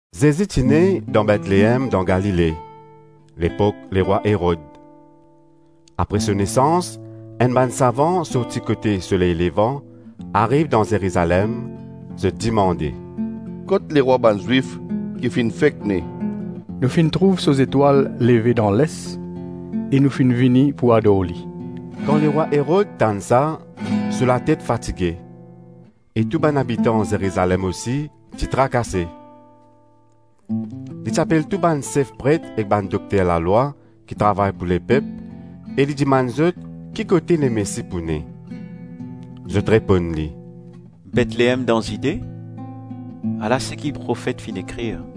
Zezi ti ne dan Betleem dan Galile, lepok lerwa Erod. Apre so nesans, enn bann savan sorti kote soley levan, ariv dan Zerizalem. Zot dimande, “Kot lerwa bann Zwif ki finn fek ne?” “Nou finn trouv so zetwal leve dan les e nou finn vini pou ador li.” Kan lerwa Erod tann sa, so latet fatige e tou bann abitan Zerizalem osi ti trakase. Li ti apel tou bann sef pret ek bann dokter lalwa ki travay pou lepep, e li dimann zot ki kote Lemesi pou ne. Zot reponn li, “Betleem dan Zide. Ala seki profet finn ekrir: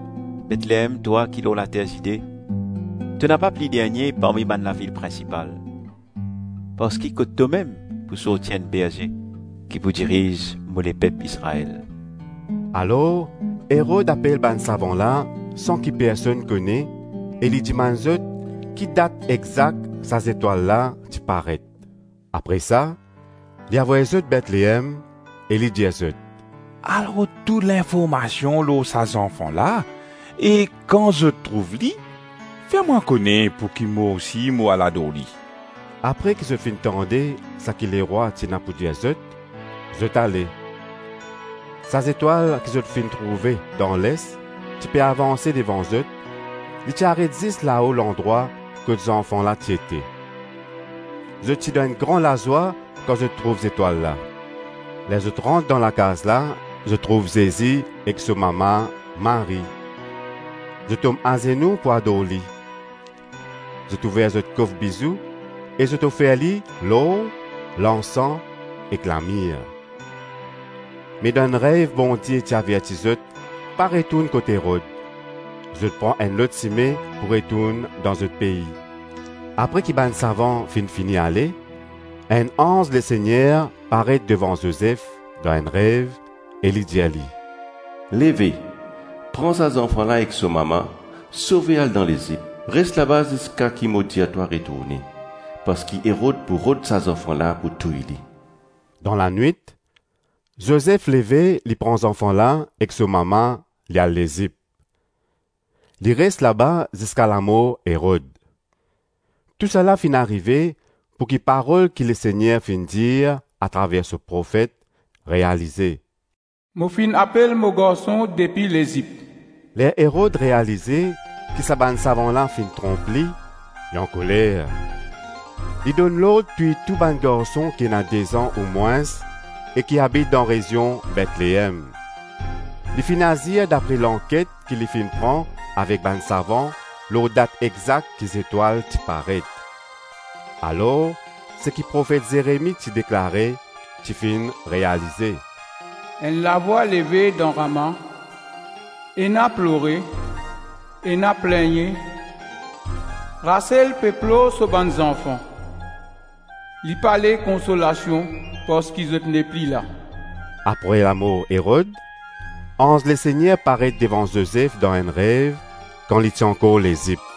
Betleem, twa ki lor later Zide to napa pli dernie parmi bann lavil prinsipal, parski kot tomem pou sorti enn berze ki pou diriz mo lepep Izrael.” Alor Erod apel bann savan la san ki personn kone e li dimann zot ki dat exak sa zetwal la ti paret. Apre sa, li avoy zot Betleem e li dir zot: “Al rod tou linformasion lor sa zanfan la, e kan zot trouv li, fer mwa kone pouki mo osi mo al ador li.” Apre ki zot finn tande saki lerwa ti ena pou dir zot, zot ale. Sa zetwal ki zot finn trouve dan les ti pe avanse devan zot, li ti aret zis lao landrwa kot zanfan la ti ete. Zot ti dan enn gran lazwa kan zot trouv zetwal la. Ler zot rant dan lakaz la, zot trouv Zezi ek so mama Marie. Zot tom azenou pou ador li; zot ouver zot kof bizou e zot ofer li lor, lansan ek lamir; me dan enn rev Bondie ti averti zot pa retourn kot Erod; zot pran enn lot sime pou retourn dan zot pei. Apre ki bann savan finn fini ale, enn anz Lesegner paret devan Zozef dan enn rev e li dir li, “Leve, pran sa zanfan la ek so mama, sove al dan Lezip; res laba ziska ki mo dir twa retourne, parski Erod pou rod sa zanfan la pou touy li.” Dan lanwit, Zozef leve li pran zanfan la ek so mama, li al Lezip. Li res laba ziska lamor Erod. Tousala finn arive pouki parol ki Lesegner finn dir atraver so profet realize “Mo finn apel mo garson depi Lezip.” Ler Erod realize ki sa bann savan la finn tronp li, li ankoler. Li donn lord touy tou bann garson ki ena de-zan ou mwins e ki abit dan rezion Betleem. Li finn azir dapre lanket ki li finn pran avek bann savan lor dat exak ki zetwal ti paret. Alor seki profet Zeremi ti deklare ti finn realize, “Enn lavwa leve dan Rama. Ena plore, ena plegne, Rasel pe plor so bann zanfan. Li pale konsolasion parski zot nepli la.” Apre lamor Erod anz Lesegner paret devan Zozef dan enn rev kan li ti ankor Lezip.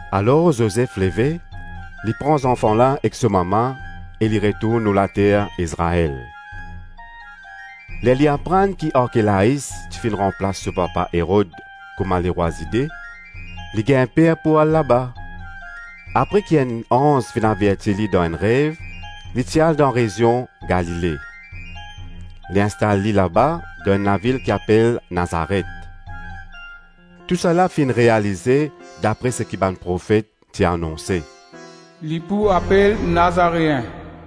Alor Zozef leve, li pran zanfan la ek so mama e li retourn lor later Izrael. Ler li aprann ki Arkelais ti finn ranplas so papa Erod kouma lerwa Zide, li gagn per pou al laba. Apre ki enn anz finn averti li dan enn rev, li ti al dan rezion Galile. Li instal li laba, dan enn lavil ki apel Nazaret. Tousala finn realize dapre seki bann profet ti anonse: “Li pou apel Nazareen.”